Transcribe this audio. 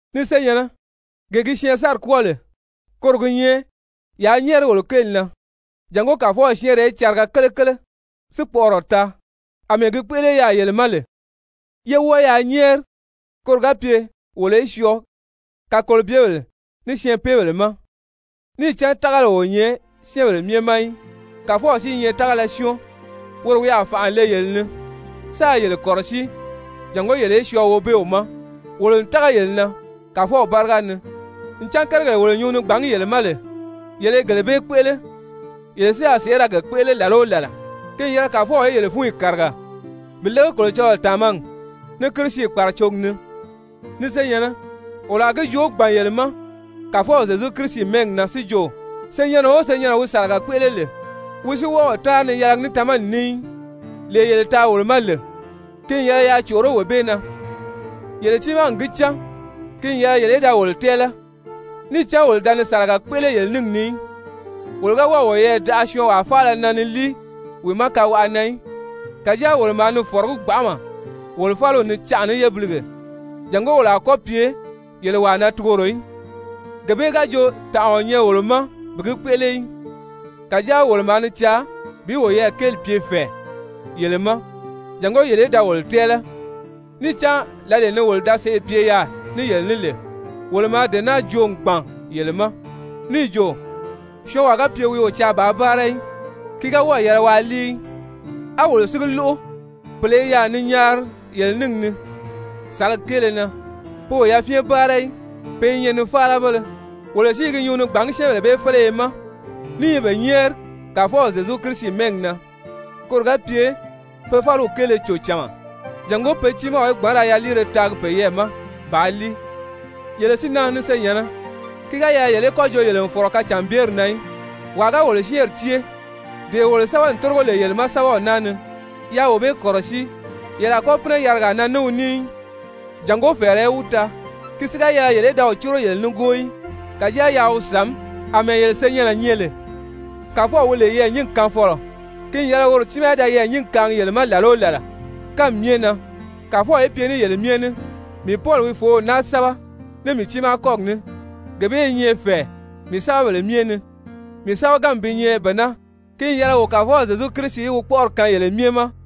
Ni senyɛ̀nnɛ, gee gi syɛɛnsanri kwɔ́ɔ lè, koro gi nyɛ yaa nyɛ́ɛri wolo kéeli na jàngó Kàfɔw syɛ́ɛnrɛ í cariga kelekele si kpɔʔɔrɔ taa, àmɛɛ gi kpéʔele yaà yele ma lè, yé wɔ́ɔ yaa nyɛ́ɛri koro ga pye wolo í syɔɔ kakolobyebèle ní syɛɛnpeebèle ma. Níì cán tágali o nyɛ syɛ́ɛnbèle myɛ ma í. Kàfɔw si i nyɛ tágala syɔ́ɔn, woro wi a fànʔa le yele ni sáā yele kɔ̀rɔsíi jàngó yele í syɔɔ Wobeew ma. Wolo n tága yele na Kàfɔw báriga ni ncan kérigèle wolo nyuu ni gbàngí yele ma lè, yele i gele bee kpéʔele, yele si a sèʔé ra ge kpéʔele làla o làla. Ki n yɛlɛ Kàfɔw í yele fúnyi kàriga bi lége Kolocɔlɔɔ tàmagi, ní Kirisi kpàracogi ni. Ni senyɛ̀nnɛ, wolo a gi joo gbàn yele ma Kàfɔw Zyezu Kirisi mɛ́ɛgi na si jo, senyɛnnɛ o senyɛnnɛ wi sàlaga kpéʔele lè, wi si wɔ́ɔ o táanri ni yɛlɛgi ní tamani ní í, lee yele taa wolo ma lè, ki n yɛlɛ yaa còʔoró wee bee na. Yele tiimaa n gi cán ki n yɛlɛ yele í da wolo tɛ́ɛlɛ, níì cán wolo da ni sàlaga kpéʔele yele níngi ni í. Wolo ga wɔ́ɔ̀ woyɛɛ daʔa syɔɔnwaa faala na ni líi wi ma kawaʔa na í. Kàjáa wolo maa ni fɔ̀rɔgí gbanʔama wolo fáliw ni canʔa ní yébilige jàngó wolo a kɔ́ pye yele wàa na tugoro í. Gee bee ga jo tànʔa o nyɛ wolo ma bi gi kpéʔele í, kàjáa wolo maa ni caa bi woyɛɛ kéeli pye fɛ̀ɛ yele ma jàngó yele í da wolo tɛ́ɛlɛ. Níì cán lǎlee ni wolo da sèʔê pye yaà ní yele ní lè, wolo maa dee naa joo n gbàn yele ma níì jo: «Syɔɔnwaa ga pye wi o caa bàā báara í, ki ga wɔ́ɔ̀ yɛlɛ waa líi í.» A wolo si gi lóʔo pèle i yaà ni nyaari yele níngi ni sàlagi kéele na, pe o yafyɛn báara í, pe i nyɛ nifaalabéle. Wolo si i gi nyuu ni gbàngí syɛ́ɛnbèle bee féleye ma, ní i be nyɛ́ɛri Kàfɔw Zyezu Kirisi mɛ́ɛgi na koro ga pye pe fáliw kéele cò cama, jàngó pe tiimaw í gbǎn ra yaliire taagi peyɛɛ ma bàā líi. Yele si na ni senyɛ̀nnɛ, ki ga yɛlɛ yele í kɔ́ jo yele n fɔ̀rɔ kacànbyeri na í. Wàa ga wolo syɛ́ɛnri cée, dee wolo sɛ́bɛ n tórigo lè yele ma sɛ́bɛw naa ni, yaa wee bee kɔ̀rɔsíi, yele a kɔ́ pínɛ yarigaa na ní wi ní í, jàngó fɛ̀ɛrɛ í wi taa. Ki si ga yɛlɛ yele í da wi córo yele nígoo í, kàjáa yaa wi sàmí àmɛɛ yele senyɛnnɛ nyɛ lè. Kàfɔw wi lè yɛɛ̀nyingi kaanfɔlɔ, ki n yɛlɛ woro tiimaa í da yɛɛ̀nyingi kaangi yele ma làla o làla, kánmi myɛ na! Kàfɔw í pye ní yele myɛ ní! Mii Pɔli wi fòów naa sɛ́bɛ ní mii tiimaa kɔ́gi ní. Gee bee i nyɛ fɛ̀ɛ mii sɛ́bɛbèle myɛ ni. Mii sɛ́bɛganmi bi nyɛ bee naa. Ki n yɛlɛ wo Kàfɔw Zyezu Kirisi í wi kpɔ́ʔɔri kaan yele myɛ ma!